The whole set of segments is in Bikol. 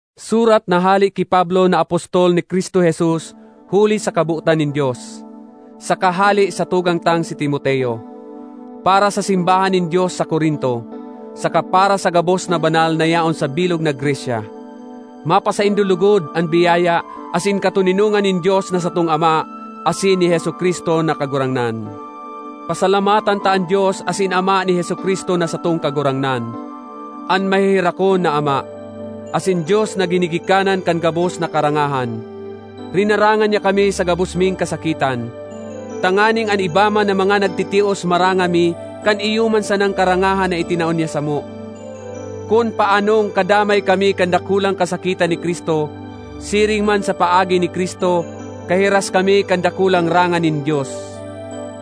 Surat na hale ki Pablo na apostol ni Cristo Jesus huli sa kabotan nin Dios, saka hale sa tugang tang si Timoteo. Para sa simbahan nin Dios sa Corinto, saka para sa gabos na banal na yaon sa bilog na Grecia. Mapasaindo logod an biyaya asin katoninongan nin Dios na satong Ama asin ni Jesu-Cristo na Kagurangnan. Pasalamatan ta an Dios asin Ama ni Jesu-Cristo na satong Kagurangnan, an maheherakon na Ama, asin Dios na ginigikanan kan gabos na karangahan. Rinaranga niya kami sa gabos ming kasakitan, tanganing an iba man na mga nagtitios maranga mi kan iyo man sanang karangahan na itinao niya samo. Kun paanong kadamay kami kan dakulang kasakitan ni Cristo, siring man sa paagi ni Cristo, kahiras kami kan dakulang ranga nin Dios.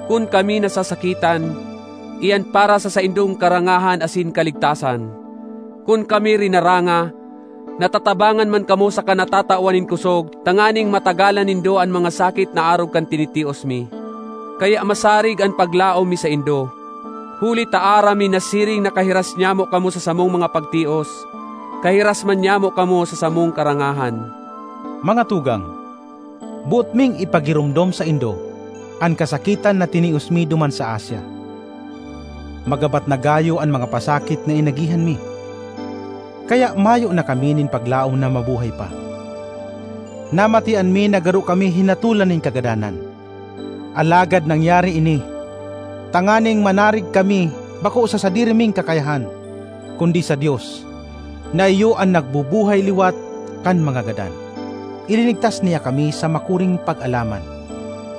Kun kami nasasakitan, iyan para sa saindong karangahan asin kaligtasan; kun kami rinaranga, natatabangan man kamo saka natatawan nin kosog tanganing matagalan nindo an mga sakit na arog kan tinitios mi. Kaya masarig an paglaom mi saindo, huli ta aram mi na siring na kahiras nyamo kamo sa samong mga pagtios, kahiras man nyamo kamo sa samong karangahan. Mga tugang, boot ming ipagiromdom saindo an kasakitan na tinios mi duman sa Asia. Magabat na gayo an mga pasakit na inagihan mi, kaya mayo na kami nin paglaom na mabuhay pa. Namatean mi na garo kami hinatolan nin kagadanan. Alagad nangyari ini tanganing manarig kami bako sa sadiri ming kakayahan kundi sa Dios na iyo an nagbubuhay liwat kan mga gadan. Ilinigtas niya kami sa makuring pag-alaman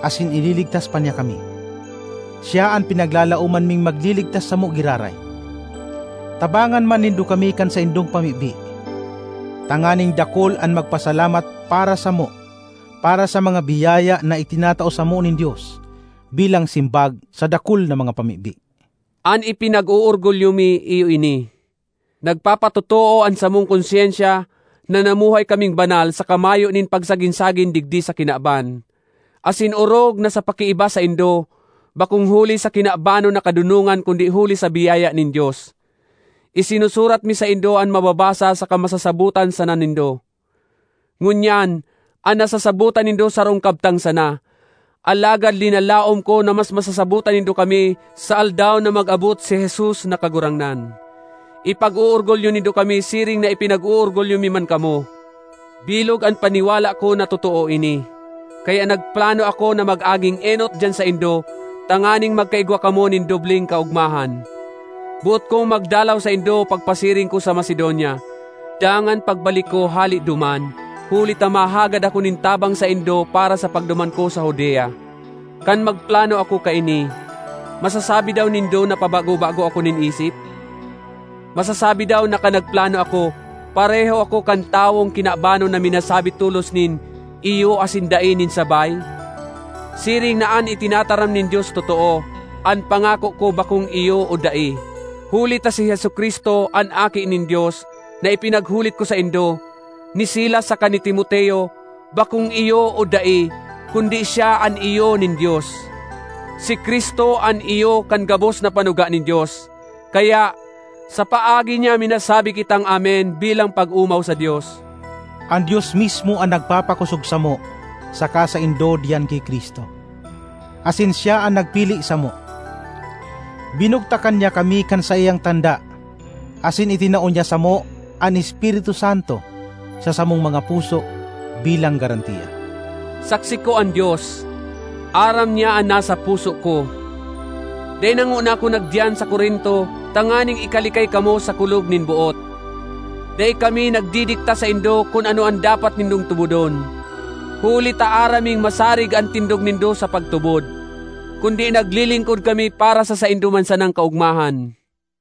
asin ililigtas pa niya kami; siya an pinaglalaoman ming magliligtas samo giraray. Tabangan man nindo kami kan saindong pamibi, tanganing dakul an magpasalamat para samo para sa mga biyaya na itinatao samo nin Dios bilang simbag sa dakul na mga pamibi. An ipinag-oorgulyo mi iyo ini: nagpapatotoo an samong konsyensya na namuhay kaming banal saka mayo nin pagsagin-sagin digdi sa kinaban, asin orog na sa pakiiba saindo, bakong huli sa kinabanon na kadonongan kundi huli sa biyaya nin Dios. Isinusurat mi saindo an mababasa saka masasabotan sana nindo. Ngunyan, an nasasabotan nindo sarong kabtang sana; alagad linalaom ko na mas masasabotan nindo kami sa Aldaw na mag-abot si Jesus na Kagurangnan; ipag-oorgulyo nindo kami siring na ipinag-oorgulyo mi man kamo. Bilog an paniwala ko na totoo ini, kaya nagplano ako na mag-aging enot diyan saindo tanganing magkaigwa kamo nin dobleng kaogmahan. Boot kong magdalaw saindo pagpasiring ko sa Macedonia dangan pagbalik ko hale duman, huli ta mahagad ako nin tabang saindo para sa pagduman ko sa Judea. Kan magplano ako kaini, masasabi daw nindo na pabago-bago ako nin isip? Masasabi daw na kan nagplano ako, pareho ako kan tawong kinabanon na minasabi tolos nin “Iyo” asin “Dai” nin sabay? Siring na an itinataram nin Dios totoo, an pangako ko bakong “Iyo” o “Dai.” Huli ta si Jesu-Cristo, an Aki nin Dios, na ipinaghulit ko saindo, ni Silas saka ni Timoteo, bakong “Iyo” o “Dai” kundi siya an “Iyo” nin Dios. Si Cristo an “Iyo” kan gabos na panuga nin Dios. Kaya, sa paagi niya minasabi kitang “Amen” bilang pag-omaw sa Dios. An Dios mismo an nagpapakosog samo saka saindo diyan ki Cristo, asin siya an nagpili samo. Binugtakan niya kami kan saiyang tanda asin itinao niya samo an Espiritu Santo sa samong mga puso bilang garantiya. Saksi ko an Dios—aram niya an nasa puso ko! Dai na ngona ako nagdiyan sa Corinto tanganing ikalikay kamo sa kulog nin boot. Dai kami nagdidikta saindo kun ano an dapat nindong tubodon, huli ta aram ming masarig an tindog nindo sa pagtubod. Kundi naglilingkod kami para sa saindo man sanang kaogmahan.